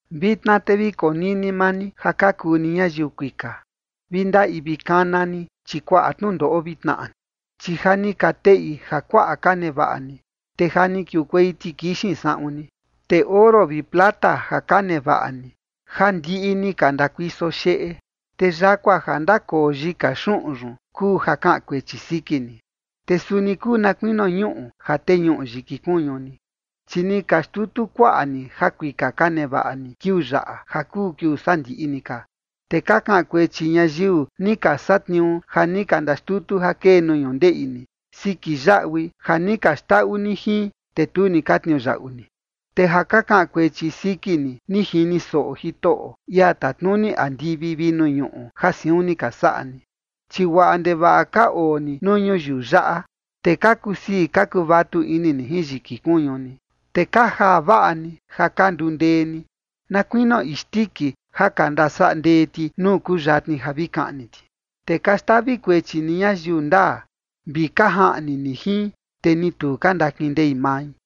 Vitna te vi konini maa ni ja ka kuu ni ñayiu kuika: Vi ndaꞌi vi kana ni, chi kuaꞌa tnundoꞌo vi tnaꞌa ni. Chi ja ni ka teꞌi jakuaꞌa ka nevaꞌa ni, te ja ni kiukuei tikixin saꞌun ni. Te oro vi plata ja ka nevaꞌa ni ja ndiꞌi ni ka ndakuiso xeꞌe. Te yakua ja ndakoo yika xuꞌun yun kuu ja kaꞌan kuechi siki ni, te suni kuu na kuinio ñuꞌu ja teñuꞌu yiki kuñu ni, chi ni ka xtutu kuaꞌa ni jakuika ka nevaꞌa ni kiuu yaꞌa, ja kuu kiuu sandiꞌi ni ka. Te ka kaꞌan kuechi ñayiu ni ka satniuu ja ni ka ndaxtutu ja kee nuu ñundeꞌi ni siki yaꞌui ja ni ka xndaꞌu ni jin, te tu ni ka tniuyaꞌu ni. Te ja ka kaꞌan kuechi siki ni, ni jini soꞌo Jitoꞌo, ia tatnuni andivi vi nuu ñuꞌu ja siun ni ka saꞌa ni. Chi guaꞌa ndevaꞌa ka oo ni nuu ñuyiu yaꞌa, te ka kusii ka kuvatu ini ni jin yiki kuñu ni, te ka jaa vaꞌa ni ja ka nduu ndee ni, na kuinio isndiki ja ka ndasaꞌa ndee ti nuu kuyatni ja vi kaꞌni ti. Te ka xtavi kuechi ni ñayiu ndaa, vi ka jaꞌni ni jin, te ni tu ka ndakindei mai.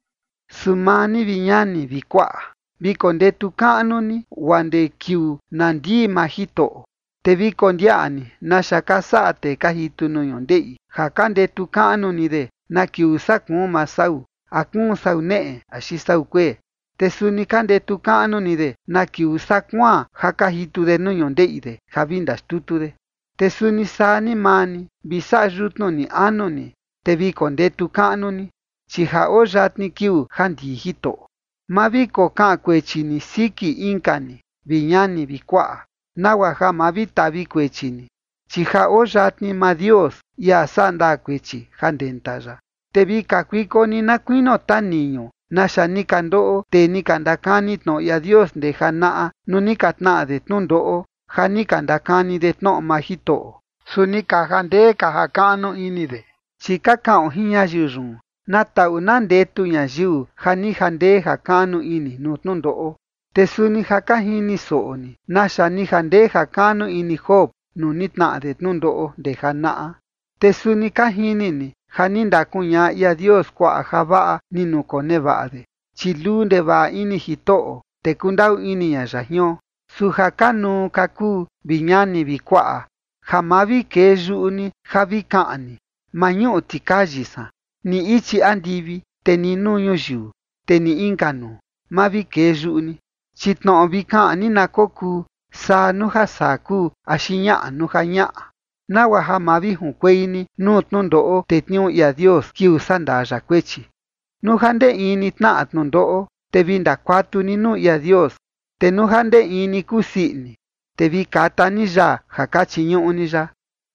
Su maa ni, vi ñani vi kuaꞌa, vi kondetu kaꞌnu ni guaa ndee kiuu na ndii maa Jitoꞌo. Te vi kondiaꞌa ni naxa ka saꞌa tee ka jitu nuu ñundeꞌi ja ka ndetu kaꞌnu ni de na kiuu saa kuun maa sau, a kuun sau neꞌe axi sau kuee. Te suni ka ndetu kaꞌnu ni de na kiuu saa kuaan ja ka jitu de nuu ñundeꞌi de ja vi ndaxtutu de. Te suni saa ni maa ni, vi saꞌa yutnu ni anu ni, te vi kondetu kaꞌnu ni, chi ja oo yatni kiuu ja ndii Jitoꞌo. Ma vi kokaꞌan kuechi ni siki inka ni, vi ñani vi kuaꞌa, nagua ja ma vi tavi kuechi ni. Chi ja oo yatni maa Dios, ia saꞌa ndaa kuechi, ja ndenta ya. Te vi kakuiko ni na kuinio taniñu naxa ni ka ndoꞌo tee ni ka ndakani tnoꞌo ia Dios ndee janaꞌa nuu ni ka tnaꞌa de tnundoꞌo ja ni ka ndakani de tnoꞌo maa Jitoꞌo, su ni ka jandee ka jakaꞌnu ini de. Chi ka kaꞌon jin ñayiu yun, na taꞌu na ndetu ñayiu ja ni jandee jakaꞌnu ini nuu tnundoꞌo. Te suni ja ka jini soꞌo ni naxa ni jandee jakaꞌnu ini Job nuu ni tnaꞌa de tnundoꞌo ndee janaꞌa. Te suni ka jini ni ja ni ndakuñaꞌa ia Dios kuaꞌa javaꞌa ni nukonevaꞌa de, chi luu ndevaꞌa ini Jitoꞌo, te kundaꞌu ini ña ya jion. Su ja kanuu ka kuu, vi ñani vi kuaꞌa, ja ma vi kee yuꞌu ni ja vi kaꞌan ni “¡maa ñuꞌu tikayi san!” ni ichi andivi, te ni nuu ñuyiu, te ni inka nuu, ma vi kee yuꞌu ni. Chi tnoꞌo vi kaꞌan ni na kokuu “saa” nuu ja saa kuu, axi “ñaꞌa” nuu ja ñaꞌa, nagua ja ma vi junkuei ni nuu tnundoꞌo tetniuu ia Dios kiuu saꞌa ndaa ya kuechi. Nuu ja ndee in ni tnaꞌa tnundoꞌo, te vi ndakuatu ni nuu ia Dios. Te nuu ja ndee in ni kusii ini, te vi kata ni yaa ja ka chiñuꞌu ni ya.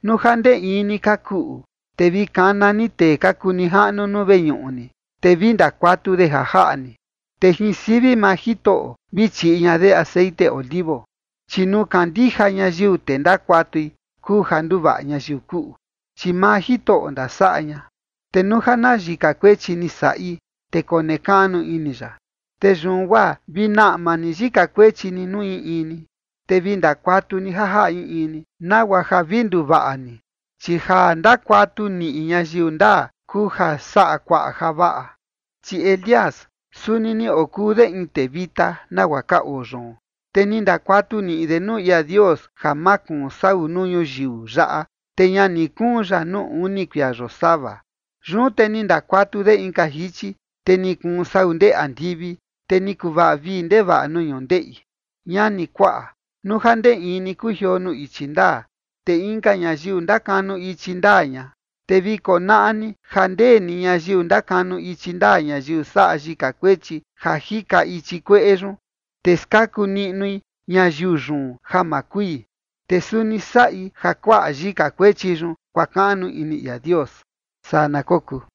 Nuu ja ndee in ni ka kuꞌu, te vi kana ni tee ka kuu nijaꞌnu nuu veñuꞌu ni, te vi ndakuatu de ja jaꞌa ni, te jin sivi maa Jitoꞌo vi chiꞌi ña de texeꞌen olivo. Chi nuu kandija ñayiu, te ndakuatui, kuu ja nduvaꞌa ñayiu kuꞌu, chi maa Jitoꞌo ndasaꞌa ña. Te nuu ja na yika kuechi ni saꞌi, te konekaꞌnu ini ya. Te yun guaa vi naꞌma ni yika kuechi ni nuu in in ni, te vi ndakuatu ni ja jaꞌa in in ni, nagua ja vi nduvaꞌa ni, chi ja ndakuatu niꞌi ñayiu ndaa kuu ja saꞌa kuaꞌa javaꞌa. Chi Elías, suni ni okuu de in tee vita nagua ka oo yoon, te ni ndakuatu niꞌi de nuu ia Dios ja ma kuun sau nuu ñuyiu yaꞌa, te ña ni kuun ya nuu uni kuia yosava. Yun te ni ndakuatu de inka jichi, te ni kuun sau ndee andivi, te ni kuvaꞌa vii ndevaꞌa nuu ñundeꞌi. Ñani, kuaꞌa, nuu ja ndee in ni kujioo nuu ichi ndaa, te inka ñayiu ndakanu ichi ndaa ña, te vi konaꞌa ni ja ndee ni ñayiu ndakanu ichi ndaa ñayiu saꞌa yika kuechi ja jika ichi kueꞌe yun, te skaku niꞌnui ñayiu yun ja ma kui. Te suni saꞌi ja kuaꞌa yika kuechi yun kuakaꞌnu ini ia Dios. Saa na kokuu.